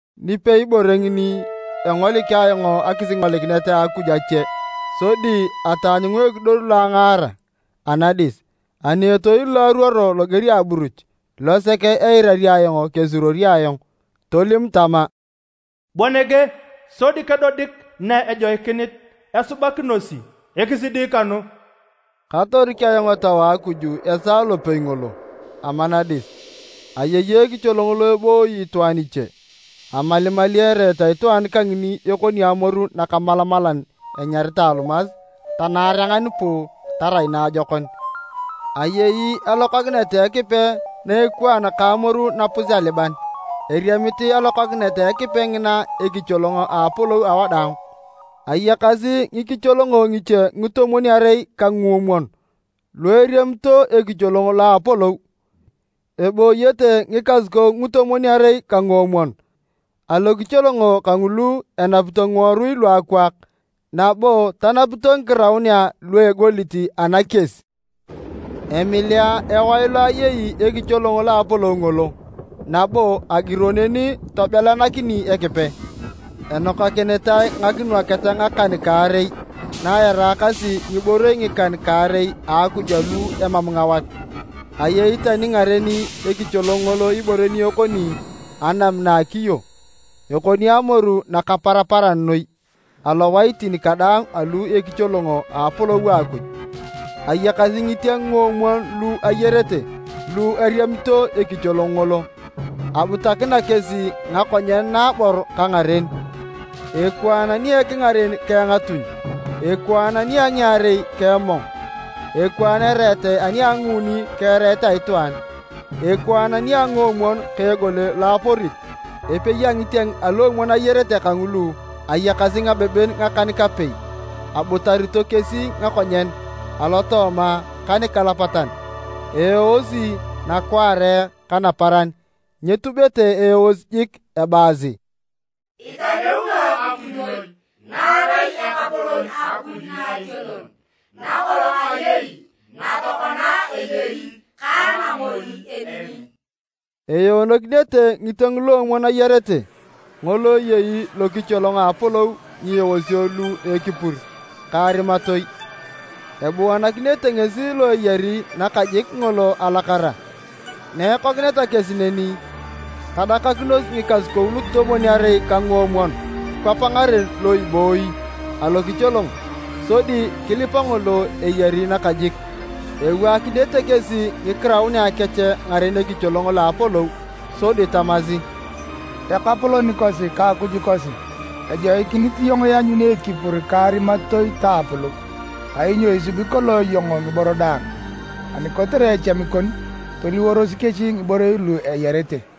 Nipei bore ngini, engolik ayong akisingolikinet a Akuj ache, sodi ataanyunga ekidor lo angaara anadis. Ani etoil lo aruo loger a aburuch, losek eirari ayong kesuruori ayong, tolim tama, “Bua nege, sodi kedodik na ejoikinit esubakinosi ekisidi kanu.” Katorik ayong Etau a Akuj esaa lopei ngolo. Ama nadis, ayei ekicholong lo ebooyo itwaan iche. Amalimali ereet a itwaan kangini ekoni amoru nakamalamalan enyaritae alumas ta naarengan puu tarai naajokon. Ayei alokakinet a Ekipe na ekwaan ka amoru napus-aliban eriemit alokakinet a Ekipe ngina ekicholong a apolou awadaang. Ayakasi ngikicholongo ngiche ngitomwon-arei ka nguomwon lu eriamito ekicholong lo a apolou. Ebooyete ngikasukou ngitomwon-arei ka nguomwon alokicholongo kangulu enapito ngiworui luakwaak nabo tanapito ngikiraunea lua egolit anakies. Emilea ewae lo ayei ekicholong lo a apolou ngolo, nabo agiro neni tobelanakini Ekipe. Enokakinitae ngakinwaket ngakan-kaarei, na eraakasi ngiborei ngikan-kaarei a Akuj lu emam ngawat. Ayei tani ngaren ekicholong ngolo ibore ni ekoni anam na a akiyo, ekoni amoru nakaparaparan noi. Alowaitin kadaang alu ekicholong a apolou a Akuj, ayakasi ngitieng nguomwon lu ayarete lu eriamito ekicholong ngolo. Abutakina kesi ngakonyen naabor ka ngaren. Ekwaan ni ekingaren ka engatuny, ekwaan nia ngiarei ka emong, ekwaan ereet ani a nguuni ka ereet a itwaan, ekwaan nia nguomwon ka egole lo aporit. Epei a ngitieng aluomwon ayarete kangulu ayakasi ngabeben ngakan-kapei, abutarito kesi ngakonyen alotooma ka nikalapatan. Eeosi nakwaare ka naparan nyetubete eeos jik ebaasi: “Italeuno Akuj noi, na erai Ekapolon Akuj Naationon, nakolong ayei, na tokona eyei ka namoi emini.” Eeonokinete ngitieng luomwon ayarete, ngolo eyei lokicholong a apolou ngieosio lu a ekipur ka arimatoi, ebuanakinete ngesi lo eyari nakajik ngolo alakara. Na ikokineta kesi neni, tadakakinos ngikasukou lutomwon-arei ka nguomwon kwap ngaren lo ibooyi alokicholong, sodi kilipa ngolo eyari nakajik. Iwaakinete kesi ngikiraunea kech ngaren ekicholong lo a apolou sodi tamasi, “Ekapolon kosi ka Akuj kosi! Ejoikinit iyong ianyuni ekipur ka arimatoi ta apolou. Kainyo isubi kolong iyong ngiboro daang, ani kotere echami kon, toliworos kesi ngiborei lu eyarete.”